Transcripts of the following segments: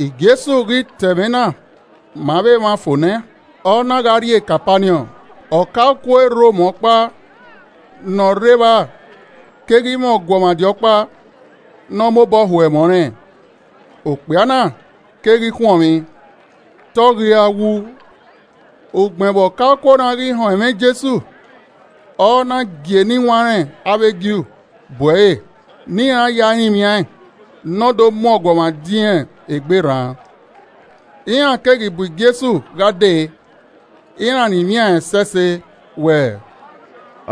Jesu ghi ta ẹmwẹ na ma avbe emwa fo nẹ, ọ na gha rrie Kapaniọn. Ọkaokuo e Rom ọkpa ne ọ rre evba keghi mwẹ ọguọmwadia ọkpa ne ọ mobọ ho ẹmwẹ ọnrẹn, okpia na keghi khuọnmwi, te ọ ghi ra wu. Ugbẹn vbe ọkaokuo na ghi họn ẹmwẹ Jesu, ọ na gie eniwanrẹn avbe Ju bu ẹre ne iran ya rinmwian ẹn ne ọ do mu ọguọmwadia irẹn egbe rran. Iran keghi bu Jesu gha dee, iran rinmwian ẹn ẹsẹse wẹẹ,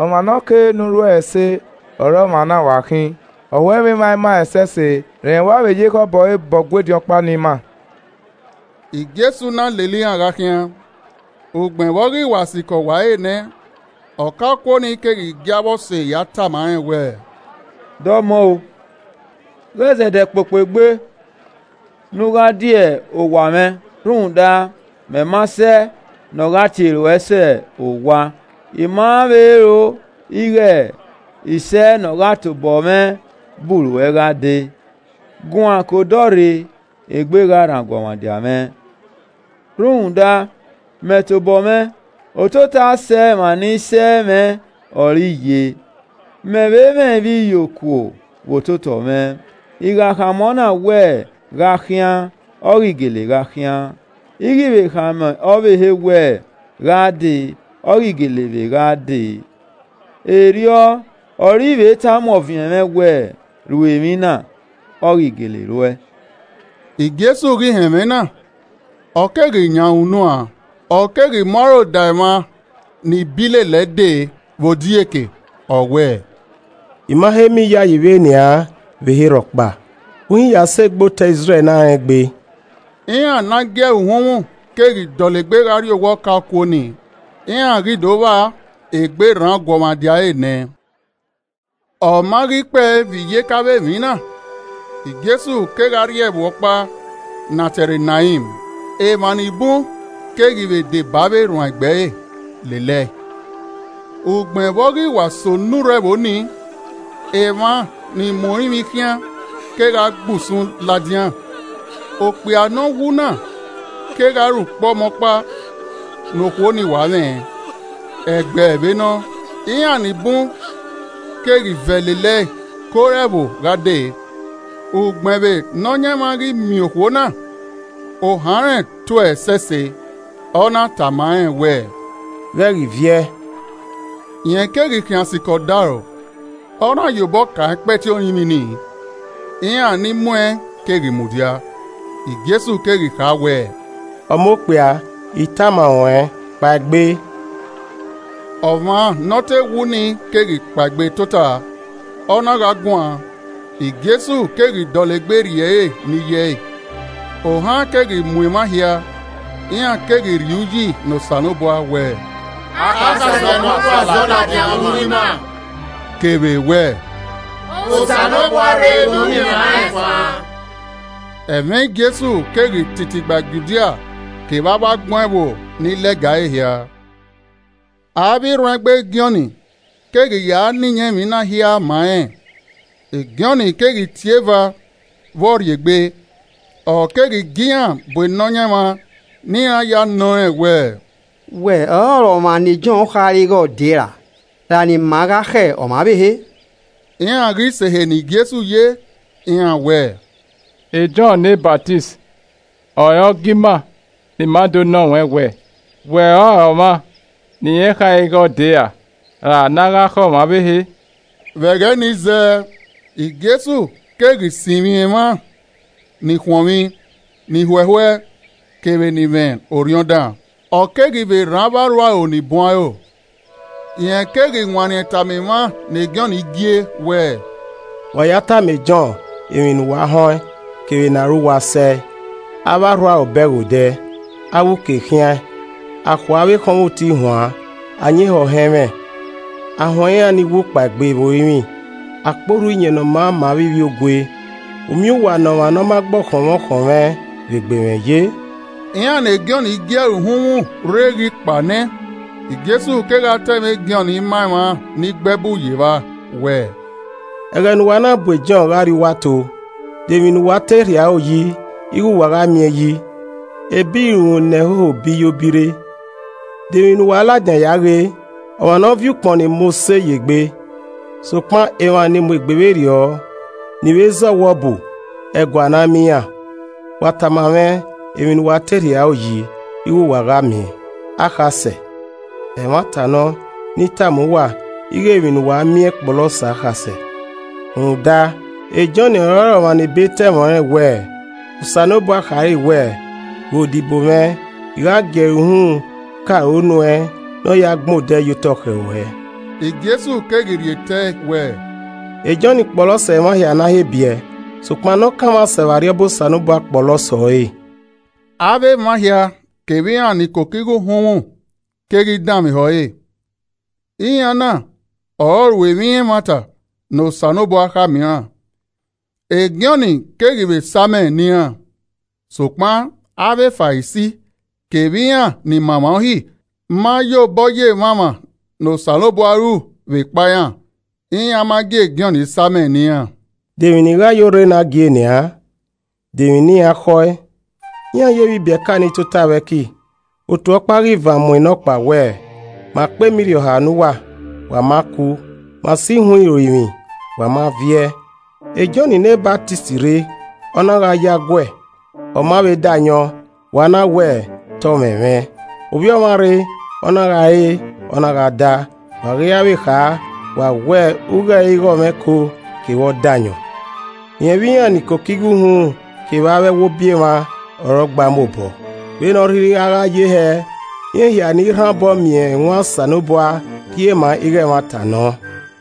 “Ọmwa ne ọ kere ne u ru ẹre ẹse ọre ọmwa na wa khin. Ọ ho ẹmwẹ emwa ima ẹsẹse, rẹn wa ye ekhọe obọ re bọ Ọgua ediọn ọkpa ne ima.” Jesu na lele iran gha khian. Ugbẹn vbe ọ ghi wa sikẹ owa ẹre nẹ, ọkaokuo ni keghi gie avbe ọse ya tama rẹn wẹẹ, “Dọmọ o, ghẹ zẹdẹ kpokpo egbe ne u gha die owa mwẹ rhunmwuda, mẹ ma sẹ ne ọ gha tie ruẹ sẹ owa. I ma vbe ro ighe I sẹe nọ gha tobọ mwẹ bu ruẹ gha dee. Guan ke odọ rre, egbe gha rran ọguọmwadia mwẹ. Rhunmwuda, mẹ tobọ mwẹ, ototọ asẹ emwa ni sẹ mwẹ ọre I ye. Mẹ vbe mwẹ ivbiyokuo vbe ototọ mwẹ. I gha khama ọna wẹ, ‘gha khian’ ọ ghi gele gha khian, I ghi vbe khama ọvbehe wẹ, ‘gha dee,’ ọ ghi gele vbe gha dee. Erriọ ọre I vbe tama ọviẹn mwẹ wẹ, ‘Ru emwi na,’ ọ ghi gele ruẹe.” Jesu ghi họn ẹmwẹ na, ọ keghi yan ẹre unuan, ọ keghi mu aro da emwa ni bii lele ẹe dee vbe odieke, ọ wẹẹ, “I ma he miẹn iyayi vbe nian vbe ehe rhọkpa, uhin ya sẹ egbe otọ Izrẹl ne arengbe.” Iran ne a gie ẹre uhunmwu keghi dọlegbe gha rrie owa ọkaokuo ni, iran ghi do vba egbe rran ọguọmwadia ẹre nẹ. Ọ ma ghi kpẹe vbe iyeke avbe emwi na, Jesu kegha rrie ẹvbo ọkpa ne a tie ẹre Nain, emwa ni bun keghi vbe deba avbe erhuanegbe ẹre lele ẹe. Ugbẹn vbe ọ ghi wa sẹ onurho ẹvbo ni, emwa ni mu orinmwi khian kegha gbe usun ladian. Okpia ne ọ wu na kegha re ukpọmọkpa ne okhuo ni wa mwẹ, ẹgbẹ vbe nọ, iran ni bun keghi vẹ lele ẹe ke ore ẹvbo gha dee. Ugbẹn vbe Nọyaẹnmwa ghi miẹn okhuo na, ohan rẹn to ẹe ẹsẹse, ọ na tama rẹn wẹẹ, “Ghẹ ghi viẹ.” Rẹn keghi khian sikẹ odaro, ọ na ye obọ kan ẹkpẹti orinmwi ni, iran ni mu ẹn keghi mudia, Jesu keghi kha wẹẹ, “Ọmọ okpia, I tama ruẹn, kpaegbe!” Ọmwa ne ọ te wu ni keghi kpaegbe tota, ọ na gha guan. Jesu keghi dọlegbe rhie ẹre ne iye ẹe. Ohan keghi mu emwa hia, iran keghi rhie uyi ne Osanobua wẹẹ, “Akhasẹ nọkhua zọ ladian vbe uwu ima,” kevbe wẹ, “Osanobua rre do miẹn emwa rẹn fan!” Ẹmwẹ Jesu keghi titi gba Judia kevbe avbe agbọn ẹvbo ni lẹga ẹre hia. Avbe erhuanegbe Jọn keghi ya na iyẹn emwi na hia ma rẹn. Jọn keghi tie eva vbọ rrie egbe. Ọ keghi gie iran bu Nọyaẹnmwa ne iran ya nọ rẹn wẹẹ, “Wẹ ọrọre ọmwa ne Jọn khare ighe ọ dee ra, ra ne ima gha khẹ ọmwa ọvbehe?” Iran ghi sẹ ehe ne Jesu ye, iran wẹẹ, “Jọn ne Ọsamẹ ọre ọ gie ima ne a do nọ ruẹn wẹ, ‘Wẹ ọrọre ọmwa ne irẹn khare ighẹ ọ dee ra, ra ne a gha khẹ ọmwa ọvbehe?’” Vbe ẹghẹ nii zẹẹ, Jesu keghi sinmwi emwa ni khuọnmwi, ni huehue, kevbe ni mwẹ orhiọn dan, ọ keghi vbe rhan avbe arhuaro ni bun aro. Rẹn keghi wanniẹn tama emwa ne Jọn gie wẹẹ, “Wa ya tama e Jọn emwi ne uwa họn ẹn kevbe ne aro uwa sẹe, avbe arhuaro bẹghe odẹ, avbe uke khiaẹn, a khue avbe ọkhọnmwoti huan, ayin ehọ họn ẹmwẹ, a huẹn ni wu kpaegbe vbe orinmwi, a kpe orhu Iyẹn Ne ọ Maa ma avbe ivbiogue. U miẹn uwa ne ọmwa ne ọ ma gbe ọkhọnmwẹ ọkhọnmwẹ vbe gbe mwẹ ye!” Iran ne Jọn gie ẹre uhunmwu rre ghi kpao nẹ, Jesu kegha ta ẹmwẹ e Jọn ma emwa ni gbe ẹbu ye evba, wẹẹ, “Ẹghẹ ne uwa na bu e Jọn gha rrie uwu ato, de emwi ne uwa te rhie aro yi ighe uwa gha miẹn yi? Ebe irunmwu ne ẹhoho bi yo bi rre? De emwi ne uwa ladian ya ghee? Ọmwa ne ọ viọ ukpọn ni mose ye egbe? Sokpan emwa ni mu egbe vberriọ, ni vbe zẹ ọwọbu, ẹguae a na miẹn iran. Wa tama mwẹ emwi ne uwa te rhie aro yi ighe uwa gha miẹn? Akhasẹ? Ẹmwata nọ, ne I tama uwa ighe emwi ne uwa miẹn kpọlọ sẹ akhasẹ. Rhunmwuda e Jọn ọrọre ọmwa ne ebe ta ẹmwẹ ọnrẹn wẹẹ, ‘Osanobua khare wẹẹ, Ghe odibo mwẹ, I gha gie ẹre uhunmwu ke aro nuẹn ne ọ ya gbẹn odẹ ye otọ khẹ ruẹ.’” Jesu keghi rhie tẹe wẹẹ, “E Jọn kpọlọ sẹ emwa hia ne a he biẹ, sokpan ne ọ kanmwa sẹ vbe Arriọba Osanobua kpọlọ sẹ ọre.” Avbe emwa hia kevbe iran ni koko igho uhunmwu keghi danmwehọ ẹre. Iran na ọre ọ ru emwi ẹmwata ne Osanobua khama iran, e Jọn keghi vbe samẹ ne iran. Sokpan avbe Farisi kevbe iran ni ma emwa Uhi ma ye obọ ye emwamwa ne Osanobua ru vbekpa iran, iran ma gie Jọn samẹ ne iran. “De emwi ne I gha ye orre na gie nian? De emwi ne iran khọe? Iran ye vbe ibieka ni tota vbe ẹki, otu ọkpa ghi van mu enọkpa wẹẹ, ‘Ma kpe ema irhiọha ne uwa, wa ma ku! Ma so ihuan orinmwi, wa ma viẹ!’ E Jọn ne Ọsamẹ rre, ọ na gha yo aguẹ, ọ ma vbe da ayọn, wa na wẹ, ‘Te ọ mwẹmwẹ.’ Ovbi Ọmwa rre, ọ na gha re, ọ na gha da, wa ghi ra vbe kha, wa wẹẹ, ‘U ghe ẹre ighe ọmwa ẹko kevbe ọdayọn, rẹn vbe iran ni koko igho uhunmwu kevbe avbe ẹwobi emwa ọre ọ gba mu obọ!’ Vbene ọ rhirhi a gha ye hẹ, iran hia ni rhan obọ miẹn ẹwaẹn Osanobua rhie ma ighe ẹmwata nọ.”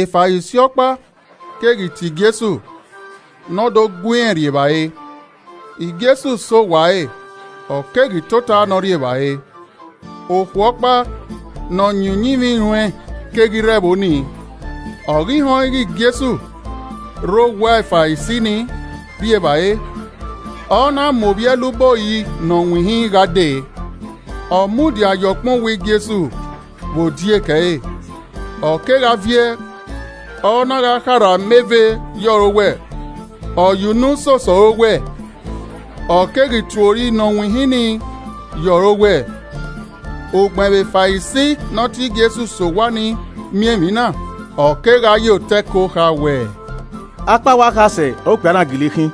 Farisi ọkpa keghi tie Jesu ne ọ do gu irẹn rri evbare. Jesu sẹ owa ẹre, ọ keghi tota ne ọ rri evbare. Okhuo ọkpa ne ọ yin uyinmwẹ iruẹn keghi rre ẹvbo nii. Ọ ghi họn ighe Jesu rre owa Farisi nii rri evbare, ọ na mu ovbi ẹluba ori nọ winhin gha dee. Ọ mudia ye ọkpẹn owẹ Jesu vbe odieke ẹre, ọ kegha viẹ, ọ na gha kharha ameve ye ọre owẹ, ọ ye unu soso ẹre owẹ, ọ keghi tue ori ne ọ winhin nii ye ọre owẹ. Ugbẹn vbe Farisi ne ọ tie Jesu sẹ owa nii miẹn emwi na, ọ kegha ye otọ ẹko kha wẹẹ, “Akpawẹ akhasẹ ọre okpia na gele khin,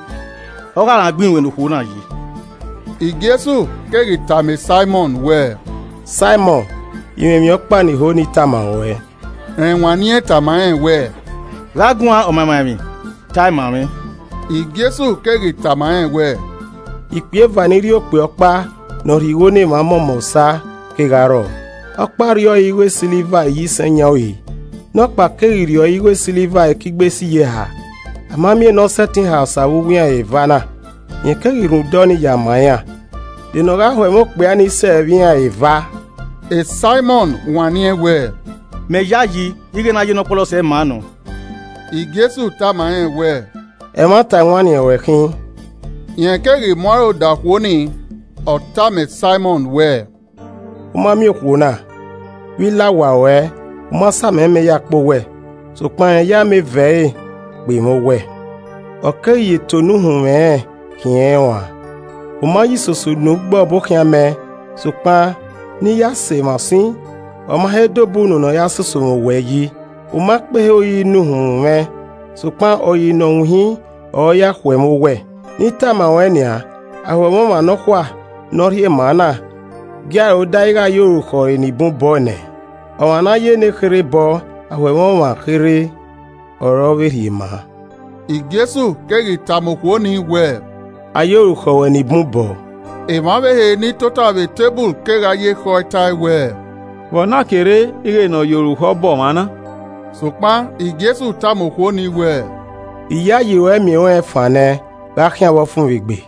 ọ gha rẹn agbọn iruẹn ne okhuo na ye!” Jesu keghi tama Saimọn wẹẹ, “Saimọn I mwẹ emwi ọkpa ne I ho ne I tama ruẹn.” Rẹn wanniẹn tama rẹn wẹẹ, “Gha guan ọmamwaemwi, ta ẹe ma mwẹ.” Jesu keghi tama rẹn wẹẹ, “Ikpia eva ni rri okpia ọkpa ne ọ rhie igho ne emwa mọmọ osa kegha rrọọ, ọkpa rri ọre igho esiliva iyisẹn yan uri, nọkpa keghi rri ọre igho esiliva ekigbe sẹ iyeha. A ma miẹn ne ọ sẹtin ha osa vbe uwu iran eva na, rẹn keghi rhunmwuda ọnii ya ma iran. De ne ọ gha ho ẹmwẹ okpia ni sẹ vbe iran eva?” Saimọn wanniẹn wẹ, “Mẹ yayi ighe ne a ya ne ọ kpọlọ sẹ ma nọ.” Jesu tama rẹn wẹẹ, “Ẹmwata ewanniẹn ruẹn khin.” Rẹn keghi mu aro da okhuo nii, ọ tama Saimọn wẹẹ, “U ma miẹn okhuo na? Vbe I la owa ruẹ, u ma sa amẹ mẹ ya kpe owẹ, sokpan rẹn ye ameve ẹre kpe mwẹ owẹ, ọ keghi ya eto ne uhunmwu ẹnrẹn khiẹn rẹn uan. U ma ye isoso unu gbe ọbokhian mẹ, sokpan ne I ya sẹ emwa usin, ọ ma he da obọ unu ne ọ ya soso mwẹ owẹ yi. U ma kpe ehe ori ne uhunmwu mwẹ, sokpan ori ne ọ winhin ọre ọ ya khuẹ mwẹ owẹ. Ne I tama ruẹn nian, a ho ẹmwẹ ọmwa nọkhua ne ọ rhie ma na, gie aro dae ighe a ye orukhọ ẹre ni bun bọe nẹ. Ọmwa ne a ya nekherhe bọ aho ẹmwẹ ọmwa kherhe ọre ọ vbe rhie ma.” Jesu keghi tama okhuo ni wẹẹ, “A ye orukhọ ruẹ ni bun bọọ.” Emwa ọvbehe ni tota vbe eteburu kegha ye ekhọe tae wẹẹ, “Vbe ọ na ke rre ighẹ ne ọ ye orukhọ bọ ọmwa na?” Sokpan Jesu tama okhuo ni wẹẹ, “Iyayi ruẹ miẹn ruẹn fan nẹ, gha khian vbe ọfumwegbe.”